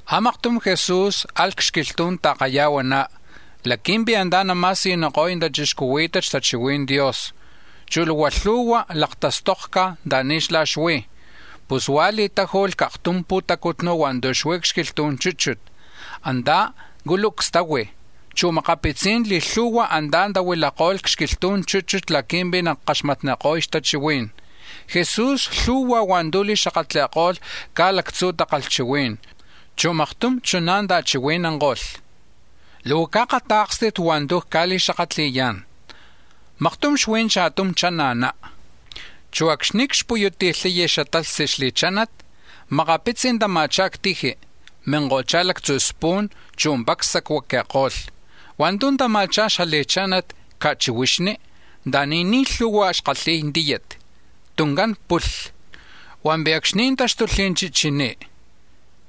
A̱maktum Jesús alh c-xquilhtu̱n ta̱kaya̱huaná̱ laqui̱mpi̱ antá̱ nama̱siyuniko̱y tachixcuhuí̱tat xtachihui̱n Dios, chu̱ luhua lhu̱hua̱ laktastokca̱ anta̱ni̱ xlá̱ xuí̱. Pus huá̱ li̱táju̱lh c-aktum pu̱tacutnu̱ hua̱ntu̱ xuí̱ c-xquilhtu̱n chúchut; antá̱ culucs tahui̱, chu̱ a̱makapitzí̱n li̱lhu̱hua̱ antá̱ tahuilako̱lh c-xquilhtu̱n chúchut laqui̱mpi̱ nakaxmatniko̱y xtachihuí̱n. Jesús lhu̱hua̱ hua̱ntu̱ li̱xakatli̱ko̱lh caj lactzu̱ takalhchihuí̱n, chu̱ maktum chuná̱ ta̱chihui̱nanko̱lh: “Luhua caakatá̱kstit hua̱ntu̱ nacca̱li̱xakatli̱yá̱n: Maktum xuí̱ cha̱tum chana̱ná. Chu̱ acxni̱ cxpuyuti̱lhay xtalhtzi xli̱chánat, makapitzi̱ tama̱chá̱ c-tiji, minko̱chá̱ lactzu̱ spu̱n, chu̱ pacs sacuaqui̱ko̱lh. Hua̱ntu̱ tama̱chá̱ xli̱chánat ca̱chihuixni, anta̱ni̱ ni̱ lhu̱hua̱ xkalhi̱y tíyat, tuncán pulhli. Hua̱mpi̱ acxni̱ táxtulh chichiní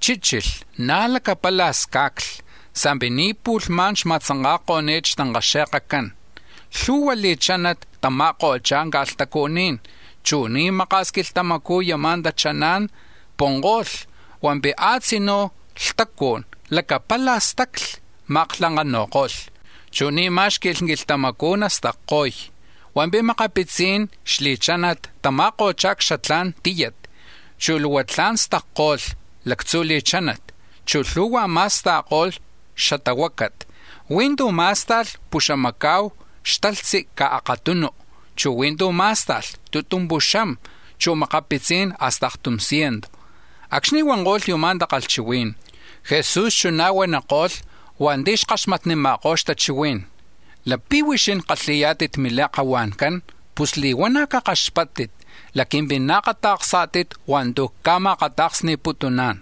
chíchilh na̱ lacapala̱ sca̱cli sa̱mpi̱ ni̱ pu̱lhmá̱n xma̱tzanka̱ko̱ni̱t xtankaxe̱kcán. Lhu̱hua̱ xli̱chánat tama̱ko̱chá̱ ca̱lhtucuní̱n, chu̱ ni̱ maka̱s quilhtamacú̱ yama̱ tachaná̱n punko̱lh, hua̱mpi̱ a̱tzinú̱ lhtucú̱n lacapala̱ stacli, ma̱aklankanu̱ko̱lh, chu̱ ni̱ má̱xqui̱lh quilhtamacú̱ nastacko̱y. Hua̱mpi̱ makapitzi̱n xli̱chánat tama̱ko̱chá̱ c-xatla̱n tíyat, chu̱ luhua tla̱n stacko̱lh lactzu̱ li̱chánat, chu̱ lhu̱hua̱ ma̱sta̱ko̱lh xatahuácat. Huí̱ tu̱ má̱sta̱lh puxamaca̱hu xtalhtzi caj akatum, chu̱ huí̱ tu̱ má̱sta̱lh tutumpuxam, chu̱ makapitzí̱n hasta aktum ciento.” Acxni̱ huanko̱lh yuma̱ takalhchihuí̱n, Jesús chuná̱ huaniko̱lh hua̱nti̱ xkaxmatnima̱kó̱ xtachihuí̱n: “¡Lapi̱ huixín kalhi̱yá̱tit mintake̱ncán pus li̱huana̱ cakaxpáttit laqui̱mpi̱ naakata̱ksá̱tit hua̱ntu̱ cca̱ma̱akata̱ksni̱putuná̱n!”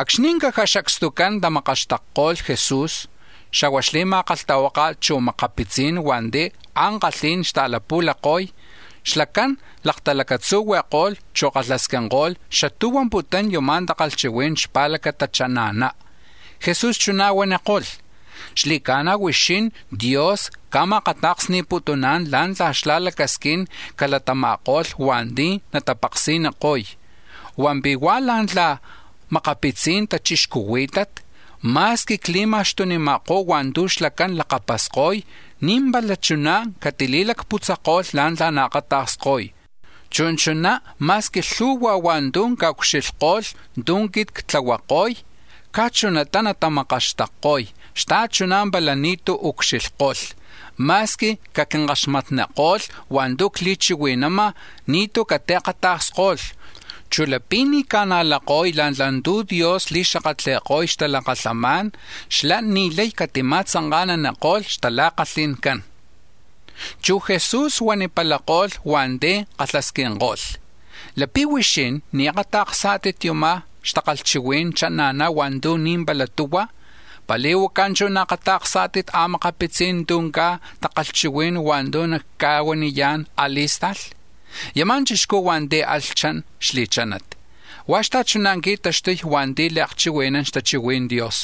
Acxni̱ caja xacstucán tamakaxtakko̱lh Jesús, xa̱hua̱ xli̱ma̱kalhtahuáka̱t, chu̱ makapitzí̱n hua̱nti̱ ankalhí̱n xta̱latla̱huanko̱y, xlacán laktalacatzuhui̱ko̱lh, chu̱ kalhasquinko̱lh xatú̱ xuamputún yama̱ takalhchihuí̱n xpa̱lacata chana̱ná. Jesús chuná̱ huaniko̱lh: “Xli̱ca̱na̱, huixín Dios ca̱ma̱akata̱ksni̱putuná̱n la̱ntla̱ xlá̱ lacasquín calatama̱ko̱lh hua̱nti̱ natapaksi̱niko̱y, hua̱mpi̱ hua̱ la̱ntla̱ makapitzi̱n tachixcuhuí̱tat, ma̱squi cli̱ma̱xtunima̱kó̱ hua̱ntu̱ xlacán lakapasko̱y, ni̱ pala chuná̱ catili̱lacputzako̱lh la̱ntla̱ naakatakskoy. Chu̱ chuná ma̱squi lhu̱hua̱ hua̱ntu̱ caucxilhko̱lh tu̱ quit ctlahuako̱y, caj chunata natamakaxtakko̱y xta̱chuná̱ pala ni̱tú̱ ucxilhko̱lh; ma̱squi caquinkaxmatniko̱lh hua̱ntu̱ cli̱chihui̱nama̱, ni̱tú̱ catiakata̱ksko̱lh. Chu̱ lapi̱ ni̱ naca̱najlay la̱ntla̱ tu̱ Dios li̱xakatli̱ko̱y xtalakalhamá̱n, xlá̱ ni̱ lay catima̱tzanka̱naniko̱lh xtala̱kalhi̱ncán.” Chu̱ Jesús huanipalako̱lh hua̱nti̱ kalhasquinko̱lh: “Lapi̱ huixín ni̱ akata̱ksá̱tit yuma̱ xatakalhchihui̱n chana̱ná̱ hua̱ntu̱ ni̱ pala tuhua̱, ¿lá̱ntla̱ chú̱ naakata̱ksá̱tit a̱makapitzí̱n tu̱ caj takalhchihuí̱n hua̱ntu̱ nactica̱huaniyá̱n a̱li̱sta̱lh? Yama̱ chixcú̱ hua̱nti̱ alh chan xli̱chánat, huá̱ xta̱chuná̱ qui̱taxtuy hua̱nti̱ li̱akchihui̱nán xtachihui̱n Dios.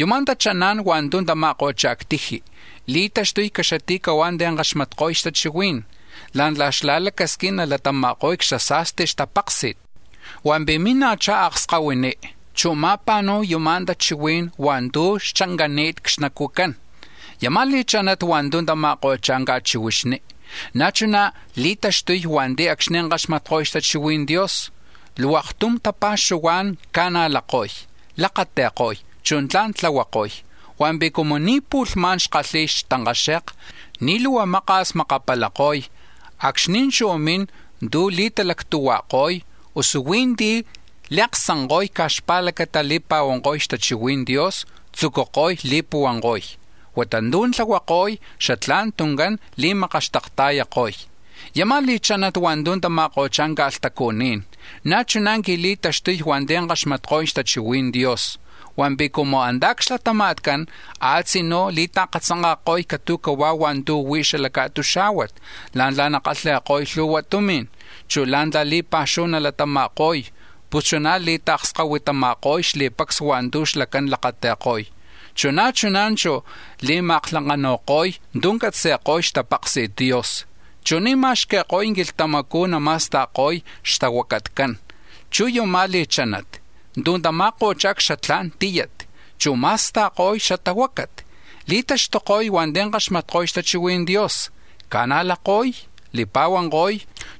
Yuma̱ tachaná̱n hua̱ntu̱ tama̱ko̱chá̱ c-tiji̱ li̱taxtuko̱y caxati̱cahuá̱ ti̱ kaxmatko̱y xtachihuí̱n la̱ntla̱ xlá̱ lacasquín nalatama̱ko̱y c-xasa̱sti xtapáksi̱t, hua̱mpi̱ mina̱chá̱ akskahuiní, chu̱ ma̱pa̱nu̱y yama̱ tachihuí̱n hua̱ntu̱ xchancani̱t c-xnacu̱cán. Yama̱ li̱chánat hua̱ntu̱ tama̱ko̱chá̱ c-ca̱chihuixni, na̱ chuná̱ li̱taxtuko̱y hua̱nti̱ acxni̱ kaxmatko̱y xtachihui̱n Dios, luhua aktum tapa̱xuhuá̱n ca̱najlako̱y, lakati̱ko̱y, chu̱ tla̱n tlahuako̱y. Hua̱mpi̱ cumu ni̱ pu̱lhmá̱n xkalhi̱y xtankaxe̱kcán, ni̱ luhua maka̱s makapalako̱y, acxni̱ chú̱ min tu̱ nali̱talactuhuajko̱y, usu huí̱ ti̱ li̱aksanko̱y caj xpa̱lacata li̱pa̱huanko̱y xtachihui̱n Dios, tzucuko̱y li̱puhuanko̱y, huata tu̱ tlahuako̱y, xatlá̱n tuncán li̱makaxtakta̱yako̱y. Yama̱ li̱chánat hua̱ntu̱ tama̱ko̱chá̱ ca̱lhtucuní̱n, na̱ chuná̱ qui̱li̱taxtuy hua̱nti̱ kaxmatko̱y xtachihui̱n Dios, hua̱mpi̱ cumu antá̱ c-xlatama̱tcán a̱tzinú̱ li̱ta̱katzanka̱ko̱y catu̱huá̱ hua̱ntu̱ huí̱ xala ca̱tuxá̱huat la̱ntla̱ nakalhi̱ko̱y lhu̱hua tumi̱n, chu̱ la̱ntla̱ li̱pa̱xuhu nalatama̱ko̱y, pus chuná̱ li̱ta̱kskahuitama̱ko̱y xli̱pacs hua̱ntu̱ xlacán lakati̱ko̱y, chu̱ na̱ chuná̱ chú̱ li̱ma̱aklankanu̱ko̱y tu̱ catzi̱ko̱y xtapaksi̱t Dios, chu̱ ni̱ ma̱xqui̱ko̱y quilhtamacú̱ nama̱sta̱ko̱y xtahuacatcán. Chu̱ yama̱ li̱chánat tu̱ tama̱ko̱chá̱ c-xatla̱n tíyat, chu̱ ma̱sta̱ko̱y xatahuácat li̱taxtuko̱y hua̱nti̱ kaxmatko̱y xtachihui̱n Dios, ca̱najlako̱y, li̱pa̱huanko̱y,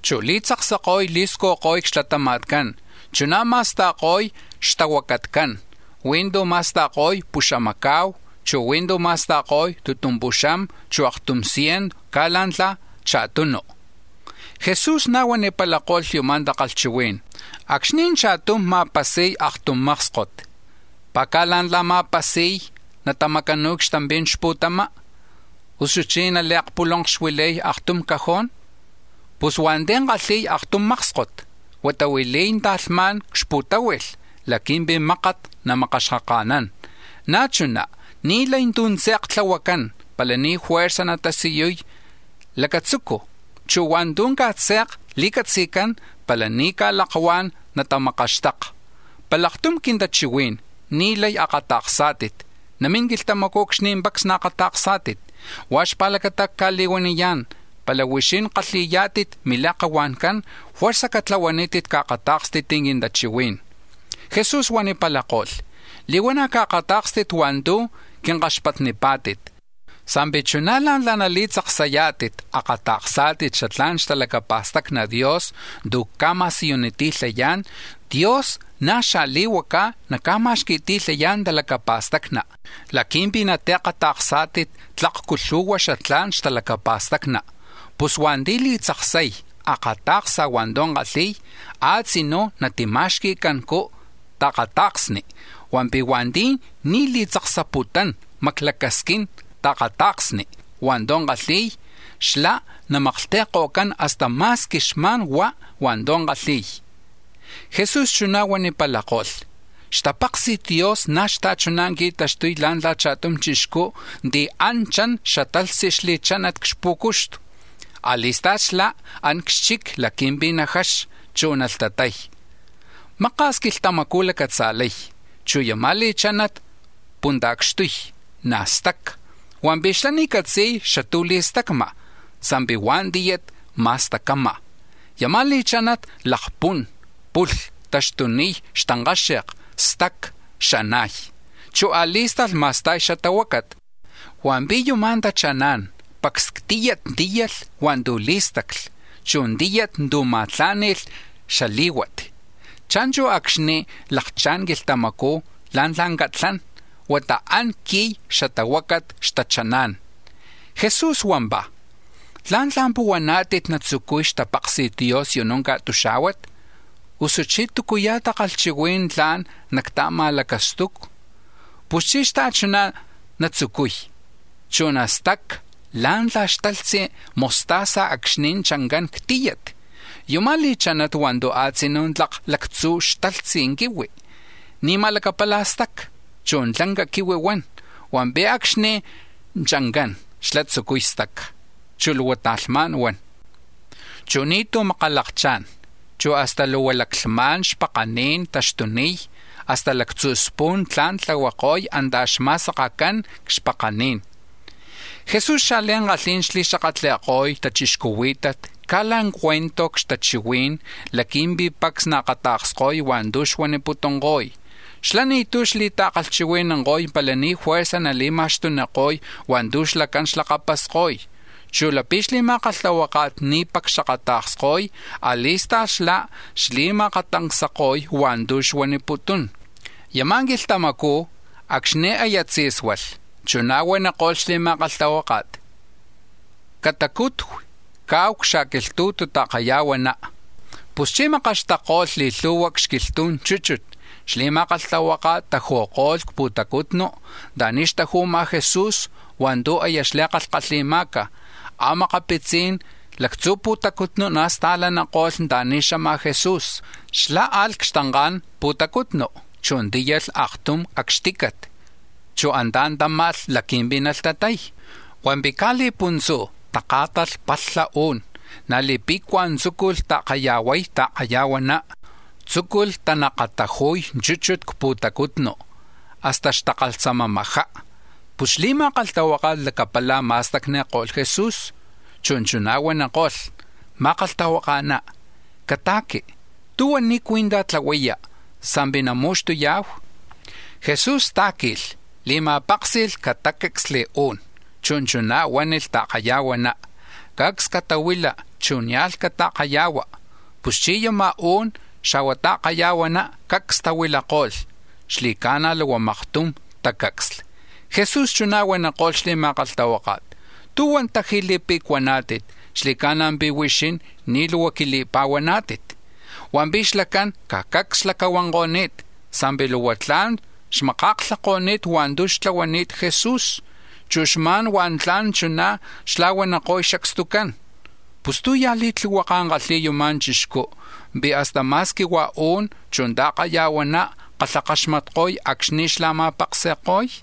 chu̱ li̱tzaksako̱y li̱scujko̱y c-xlatama̱tcán, chuná̱ ma̱sta̱ko̱y xtahuacatcán: huí̱ tu̱ ma̱sta̱ko̱y puxamaca̱hu, chu̱ huí̱ tu̱ ma̱sta̱ko̱y tutumpuxam, usu aktum ciento caj la̱ntla̱ cha̱tunu.” Jesús na̱ huanipalako̱lh yuma̱ takalhchihuí̱n: “Acxni̱ cha̱tum ma̱pasi̱y aktum mákskot, ¿pi̱ caj la̱ntla̱ nama̱pasi̱y natamacanu̱y c-xtampi̱n xpu̱tama? ¿Usuchí̱ nali̱talahuili̱y aktum cajón? Pus hua̱nti̱ kalhi̱y aktum mákskot huata huili̱y ta̱lhmá̱n c-xpu̱táhui̱lh laqui̱mpi̱ mákat namakaxkaka̱nán. Na̱ chuná̱ ni̱ lay tú̱ tze̱k tlahuacán pala ni̱ fuerza̱ natasiyuy lacatzucu̱, chu̱ hua̱ntu̱ caj tze̱k li̱catzi̱cán pala ni̱ ca̱lakuá̱n natamakaxtaka. Pala aktum quintachihuí̱n ni̱ lay akata̱ksá̱tit, namín quilhtamacú̱ acxni̱ pacs naakata̱ksá̱tit. Huá̱ xpa̱lacata̱ cca̱li̱huaniyá̱n, pala huixín kalhi̱yá̱tit mintake̱ncán fuerza̱ catlahuanítit caakatá̱kstit quintachihuí̱n.” Jesús huanipalako̱lh: “Li̱huana̱ caakatá̱kstit hua̱ntu̱ quinkaxpatnipá̱tit, sa̱mpi̱ chuná̱ la̱ntla nali̱tzaksati̱lhayá̱tit akata̱ksá̱tit xatla̱n xtalacapa̱stacni Dios tu̱ cca̱ma̱siyuniti̱lhayá̱n, Dios na̱ xaa̱li̱huacá̱ naca̱ma̱xqui̱ti̱lhayá̱n talacapa̱stacni̱ laqui̱mpi̱ natiakata̱ksá̱tit tlakcu lhu̱hua xatla̱n xtalacapa̱stacni. Pus hua̱nti̱ laktzaksay akata̱ksa̱ hua̱ntu̱ kalhi̱y, a̱tzinú̱ natima̱xqui̱cancú ta̱kata̱ksni; hua̱mpi̱ hua̱nti̱ ni̱ li̱tzaksaputún maclacasquín ta̱kata̱ksni̱ hua̱ntu̱ kalhi̱y, xlá̱ namaklhti̱ko̱cán hasta ma̱squi xma̱n huá̱ hua̱ntu̱ kalhi̱y.” Jesús chuná̱ huanipalako̱lh: “Xtapaksi̱t Dios na̱ xta̱chuná̱ qui̱taxtuy la̱ntla̱ cha̱tum chixcú̱ ti̱ an chan xtalhtzi xli̱chánat c-xpú̱cuxtu. A̱li̱sta̱lh xlá̱ an c-xchic laqui̱mpi̱ najaxa, chu̱ nalhtatay. Maka̱s quilhtamacú̱ nalacatza̱lay, chu̱ yama̱ li̱chánat punta̱cxtuy, na̱ staca, hua̱mpi̱ xlá̱ ni̱ catzi̱y xatú̱ li̱stacma̱, sa̱mpi̱ hua̱ tíyat ma̱stacama̱. Yama̱ li̱chánat lakpún, pulha, taxtuniy xtankáxe̱k, staca, xana̱y, chu̱ a̱li̱sta̱lh ma̱sta̱y xatahuácat, hua̱mpi̱ yuma̱ tachaná̱n pacs c-tíyat tíyalh hua̱ntu̱ lí̱stacli, chu̱ tíyat tu̱ ma̱láni̱lh xalí̱huat. Cha̱nchu̱ acxni̱ lakchá̱n xquilhtamacú̱ la̱ntla̱ catlán huata an qui̱y xtahuacat xtachaná̱n.” Jesús huampá̱: “¿La̱ntla̱ puhuaná̱tit natzucuy xtapaksi̱t Dios yunú̱ ca̱tuxá̱huat? Usuchí̱ ¿túcuya̱ takalhchihuí̱n tla̱n xta̱ma̱lacaxtumi̱hu? Puschí̱ xta̱chuná̱ natzucuy, chu̱ nastaca̱ la̱ntla̱ xtalhtzi mostaza acxni̱ chancán c-tíyat. Yuma̱ li̱chánat hua̱ntu̱ a̱tzinú̱ tlak lactzu̱ xatalhtzi quihui̱ ni̱ma̱ lacapala̱ staca, chu̱ tlanca quihui huan. Hua̱mpi̱ acxni̱ chancán xlá̱ tzucuy staca, chu̱ luhua ta̱lhmá̱n huan; chu̱ ni̱tú̱ makalakchá̱n, chu̱ hasta luhua laclhma̱n xpakaní̱n taxtuniy, hasta lactzu̱ spu̱n tla̱n tlahuako̱y antá̱ xma̱sakacán c-xpakaní̱n.” Jesús xliankalhí̱n xli̱xakatli̱ko̱y tachixcuhuí̱tat caj la̱ cuento c-xtakalhchihuí̱n laqui̱mpi̱ pacs naakata̱ksko̱y hua̱ntu̱ xuaniputunko̱y. Xlá̱ ni̱tú̱ xli̱ta̱chihui̱nanko̱y pala ni̱ fuerza̱ nali̱ma̱xtuniko̱y hua̱ntu̱ xlacán xlakapasko̱y; chu̱ lapi̱ xli̱ma̱kalhtahuáka̱t ni̱ pacs xakata̱ksko̱y, a̱li̱sta̱lh xlá̱ xli̱ma̱akata̱ksni̱ko̱y hua̱ntu̱ xuaniputún. Yama̱ quilhtamacú̱ acxni̱ aya tzí̱sualh, chuná̱ huaniko̱lh xli̱ma̱kalhtahuáka̱t: —Catacutui̱ caahu c-xa̱quilhtu̱tu ta̱kayahuaná. Puschí̱ makaxtakko̱lh li̱lhu̱hua̱ c-xquilhtu̱n chúchut, xli̱ma̱kalhtahuáka̱t taju̱ko̱lh c-pu̱tacutnu̱ anta̱ni̱ xtaju̱ma̱ Jesús hua̱ntu̱ aya xli̱kalhkalhi̱ma̱ca̱. A̱makapitzí̱n lactzu̱ pu̱tacutnu̱ na̱ sta̱laniko̱lh anta̱ni̱ xama̱ Jesús. Xlá̱ alh c-xtanka̱n pu̱tacutnu, chu̱ tíyalh aktum acxtícat, chu̱ antá̱ táma̱lh laqui̱mpi̱ nalhtatay. Hua̱mpi̱ caj li̱puntzú̱ taká̱talh palha u̱n, na̱ li̱pe̱cua̱ tzúculh ta̱kaya̱huay ta̱kaya̱huaná, tzúculh tanakataju̱y chúchut c-pu̱tacutnu, hasta xtakalhtzamamajá. Pus xli̱ma̱kalhtahuáka̱t lacapala̱ ma̱stacuani̱ko̱lh Jesús, chu̱ chuná̱ huaniko̱lh: —Ma̱kalhtahuaka̱ná, cata̱qui. ¿Tú̱ xpa̱lacata ni̱ cuí̱ntaj tlahuaya̱ sa̱mpi̱ namu̱xtuya̱hu? Jesús tá̱qui̱lh, li̱ma̱páksi̱lh catácacsli̱ u̱n, chu̱ chuná̱ huánilh ta̱kaya̱huaná: —¡Cacs catahuila, chu̱ nia̱lh cata̱kaya̱hua! Puschí̱ yama̱ u̱n xa̱hua̱ ta̱kaya̱huaná cacs tahuilako̱lh. Xli̱ca̱na̱ luhua maktum tacá̱cacsli. Jesús chuná̱ huaniko̱lh xli̱ma̱kalhtahuáka̱t: —¿Tú̱huan taji̱ li̱pe̱cuaná̱tit? ¡Xli̱ca̱na̱ pi̱ huixín ni̱ luhua quili̱pa̱huaná̱tit! Hua̱mpi̱ xlacán caj cacs xlacahuanko̱ni̱t, sa̱mpi̱ luhua tla̱n xmaka̱klhako̱ni̱t hua̱ntu̱ xtlahuani̱t Jesús, chu̱ xma̱n huá̱ tla̱n chuná̱ xla̱huaniko̱y xacstucán: —¿Pus tú̱ ya̱ li̱tlihuaka̱ kalhi̱y yuma̱ chixcú, pi̱ hasta ma̱squi hua̱ u̱n, chu̱ ta̱kaya̱huaná̱ kalhakaxmatko̱y acxni̱ xlá̱ ma̱paksi̱ko̱y?